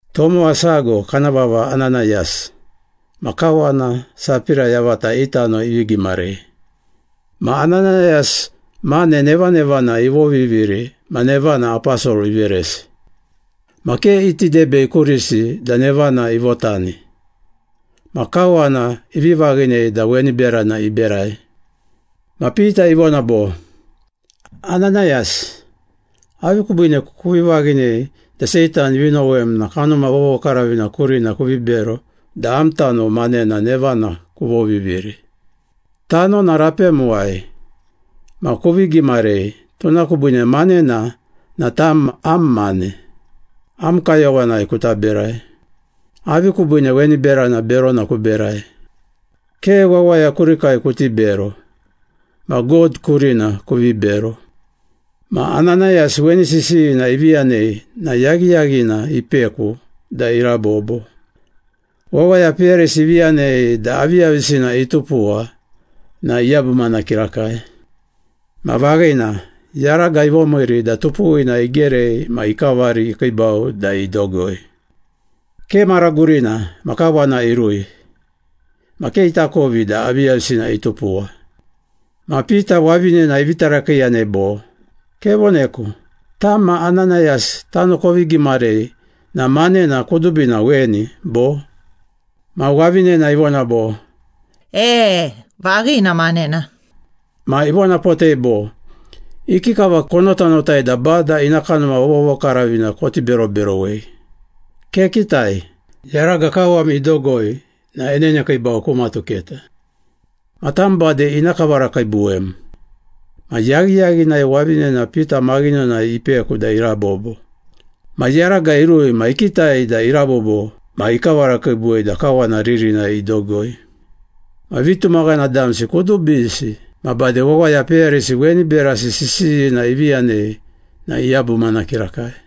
Tomowa sago kana vava Ananayas, ma kawana Sapira yavata i tano ivi gimarei. Ma Ananayas mane nevanevana ivoviviri ma nevana aposol iveresi. Ma ke iti debei kurisi da nevana ivotani, ma kawana ivi vaghinei da weni berana iberai. Ma Pita ivona bo, “Ananayas, avi kubiine kuvi vaghinei da Seitan ivi nowem na Kanuma Vovokaravina kurina kuvi bero da am tano manena nevana kuvoviviri? Tanona rapemuwai ma kuvi gimarei, tuna kubiine manena na tam am mane, am kayowanai kuta berai. Avi kubiine weni berana berona kuberai? Ke wawaya kurikai kuti bero, ma God kurina kuvi bero!” Ma Ananayas weni sisiyina ivi yanei na yaghiyaghina ipeku da irabobo. Wawaya peyarisi ivi yanei da aviyavisina itupuwa na iyabumana kirakai. Ma vaghina, yaraga ivomiiri da tupuwina igerei ma ikavari ikiibau da idogoi. Ke mara gurina ma kawana irui, ma ke itakovi da aviyavisina itupuwa. Ma Pita wavinena ivi tarakiiyanei bo, “Kevoneku, tam ma Ananayas tano kovi gimarei na manena kudubina weni, bo?” Ma wavinena ivona bo, “E, vaghina manena.” Ma ivonapotei bo, “Ikikava konotanotai da Bada ina Kanuma Vovokaravina koti beroberowei? Kekitai, yaraga kawam idogoi na enenekiibau ku matuketa. Ma tam bade ina kavarakiibuwem.” Ma yaghiyaghinai wavinena Pita maghinonai ipeku da irabobo. Ma yaraga irui ma ikitai da irabobo ma ikavarakiibuwei da kawana ririnai idogoi. Ma vitumaghana damsi kudubisi ma bade wawaya peyarisi weni berasi sisiyina ivi yanei na iyabumana kirakai.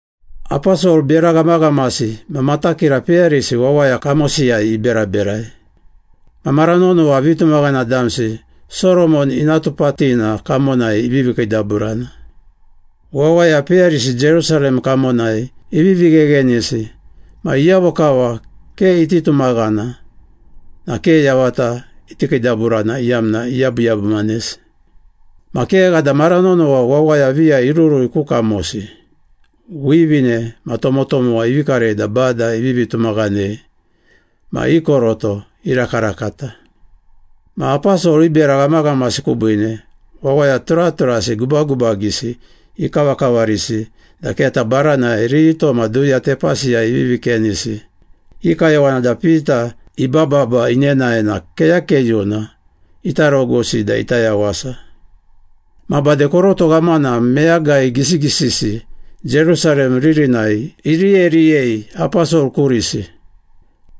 Aposol bera ghamaghamasi ma matakira peyarisi wawaya kamosiyai iberaberai. Ma mara nonowa vitumaghana damsi Soromon Ina Tupatina kamonai ivivi kiidaburana. Wawaya peyarisi Jerusalem kamonai ivivi gheghenisi ma iyavo kava ke iti tumaghana na ke yavata iti kiidaburana iyamna iyabuyabumanesi. Ma kegha da mara nonowa wawaya viya irurui ku kamosi, wivine ma tomotomowa ivi karei da Bada ivivi tumaghanei ma i koroto irakarakata. Ma aposol i bera ghamaghamasi kubiine, wawaya turaturasi gubagubagisi ikavakavarisi da keta baranai rito ma duya tepasiyai ivivi kenisi. I kayowana da Pita ibababa inenae na keyakeyuna ita rogusi da ita yawasa. Ma bade koroto ghamana meyagai gisigisisi Jerusalem ririnai iriyeriyei aposol kurisi.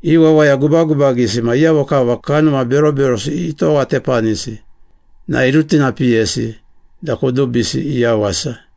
I wawaya gubagubagisi ma iyavo kava kanuma beroberosi itowatepanisi na irutinapiyesi da kudubisi iyawasa.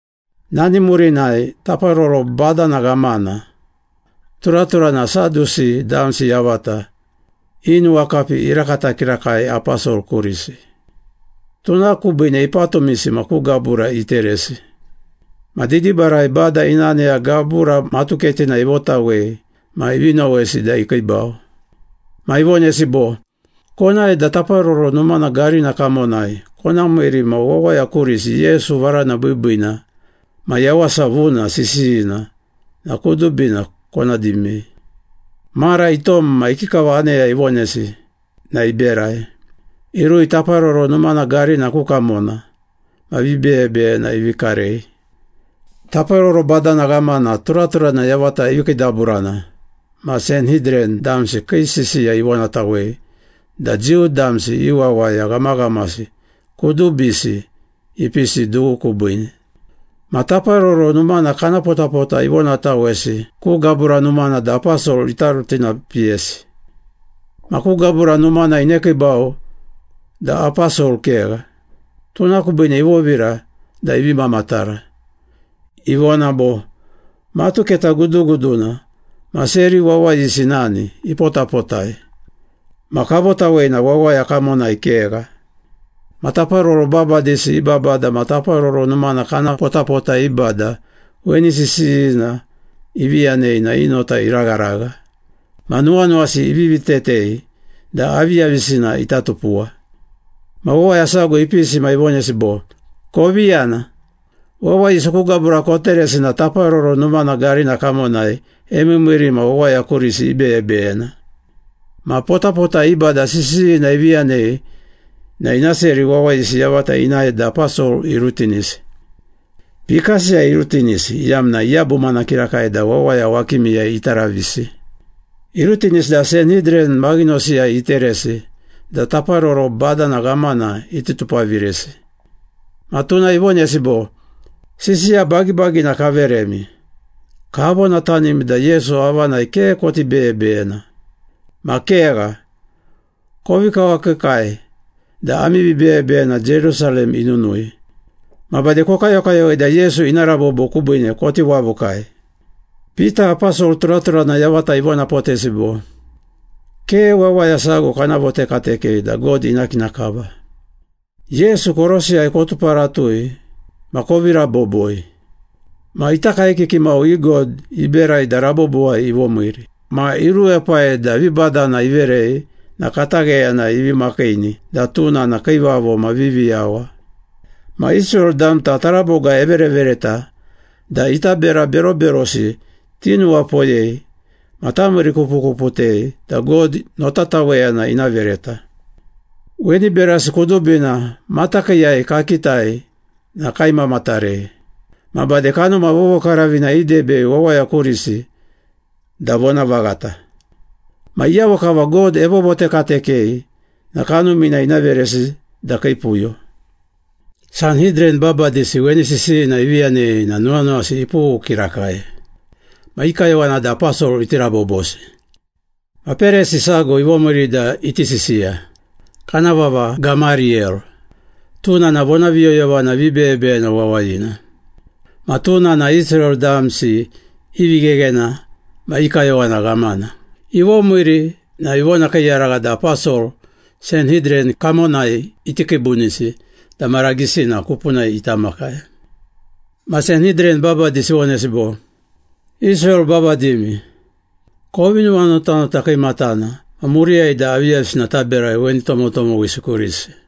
Nani murinai taparoro badana ghamana, turaturana Sadusi damsi yavata i nuwakapi irakata kirakai aposol kurisi. Tuna kubiine ipatumisi ma ku gabura iteresi. Ma didibarai Bada ina aneya gabura matuketina ivotawei ma ivi nowesi da ikiibau. Ma ivonesi bo, “Konae da Taparoro Numana garina kamonai kona miiri ma wawaya kurisi Yesu varana biibiina ma yawasa vuna sisiyina na kudubina kona dimei.” Mara itom ma ikikava aneya ivonesi na iberai. Irui Taparoro Numana garina ku kamona ma vibeyebeyena ivi karei. Taparoro badana ghamana turaturana yavata ivi kiidaburana ma Sanhidran damsi kii sisiya ivonatawei da Jiu damsi i wawaya ghamaghamasi kudubisi ipisi dughu kubiine. Ma Taparoro Numana kana potapota ivonatawesi ku gabura numana da aposol ita rutinapiyesi. Ma ku gabura numana inekiibau da aposol kegha. Tuna kubiine ivovira da ivi mamatara, ivona bo, “Matuketa guduguduna ma seri wawayisi nani, ipotapotai. Ma kavotawei na wawaya kamonai kegha.” Ma taparoro babadisi i babada ma Taparoro Numana kana potapota i bada weni sisiyina ivi yanei na i nota iragharagha. Ma nuwanuwasi ivivi tetei da aviyavisina ita tupuwa. Ma wawaya sago ipisi ma ivonesi bo, “Kovi yana, wawayisi ku gabura koteresi na Taparoro Numana garina kamonai emiimiiri ma wawaya kurisi ibeyebeyena.” Ma potapota i bada sisiyina ivi yanei na ina seri wawayisi yavata inae da aposol irutinisi. Pikasiyai irutinisi iyamna iyabumana kirakai da wawaya wakimiyai ita ravisi. Irutinisi da Sanhidran maghinosiyai iteresi da taparoro badana ghamana iti tupaviresi. Ma tuna ivonesi bo, “Sisiya bagibagina kaveremi, kavonatanimi da Yesu avanai ke koti beyebeyena. Ma kegha, kovi kawakiikai da ami vibeyebeyena Jerusalem inunui. Ma bade kokayokayowei da Yesu ina rabobo kubiine koti wavukai.” Pita aposol turaturana yavata ivonapotesi bo, “Ke wawaya sago kana votekatekei da God ina kina kava! Yesu korosiyai kotuparatui ma kovi raboboi. Ma ita kaekiki mau i God iberai da rabobowai ivomiiri ma iruepai da vibadana iverei na katagheyanai ivi makiini da tuna na Kiivavo ma Viviyawa. Ma Israel damta taraboga everevereta da ita bera beroberosi tinuwapoyei ma tamiirikupukuputei da God notataweyana ina vereta. Weni berasi kudubina matakiiyai kakitai na kaimamatarei. Ma bade Kanuma Vovokaravina idebei wawaya kurisi da vonavaghata. Ma iyavo kava God evovotekatekei na Kanumina ina veresi da kii puyo.” Sanhidran babadisi weni sisiyina ivi yanei na nuwanuwasi ipughu kirakai. Ma i kayowana da aposol iti rabobosi. Ma Perisi sago ivomiiri da iti sisiya. Kana vava Gamariyel, tuna na vonaviyoyovana vibeyebeyena wawayina. Ma tuna na Israel damsi i vigheghena ma i kayowana ghamana. Ivomiiri na ivonakiiyaragha da aposol Sanhidran kamonai iti kiibunisi da mara gisina kupunai ita makai. Ma Sanhidran babadisi ivonesi bo, “Israel babadimi, kovi nuwanotanota kiimatana ma muriyai da aviyavisina taberai weni tomotomowisi kurisi.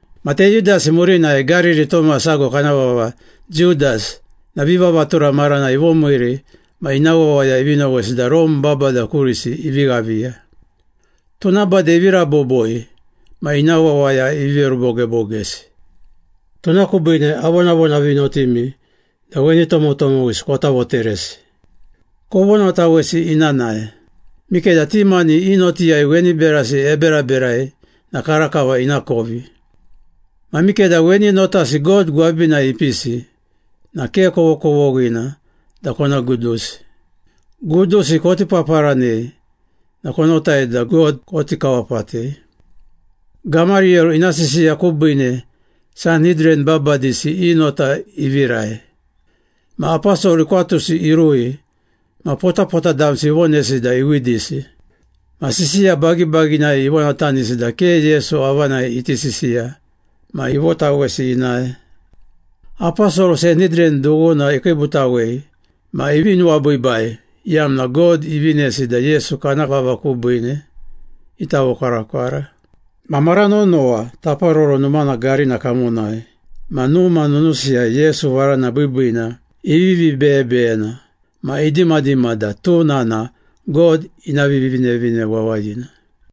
Ma Teyudasi murinai Gariri tomowa sago kana vava Judas na vivavatura maranai ivomiiri ma ina wawaya ivi nowesi da Rome babada kurisi ivi ghaviya. Tuna bade ivi raboboi ma ina wawaya ivi verubogebogesi. Tuna kubiine avonavonavinotimi da weni tomotomowisi kota voteresi. Kovonatawesi ina nae. Mikeda ti mani i notiyai weni berasi eberaberai na karakava ina kovi. Ma mikeda weni notasi God gwabinai ipisi na ke kovokovoghina da kona gudusi. Gudusi koti paparanei na konotai da God koti kawapatei.” Gamariyel ina sisiya kubiine Sanhidran babadisi i nota ivirai. Ma aposol ikwatusi irui ma potapota damsi ivonesi da iwidisi. Ma sisiya bagibaginai ivonatanisi da ke Yesu avanai iti sisiya ma ivotawesi inae. Aposol Sanhidran dughuna ikiibutawei ma ivi nuwabiibai, iyamna God ivinesi da Yesu kana vava kubiine ita vokwarakwara. Ma mara nonowa Taparoro Numana garina kamonai ma numa nunusiyai Yesu Varana Biibiina ivivi beyebeyena ma idimadima da tuna na God ina Vivinevine Wawayina.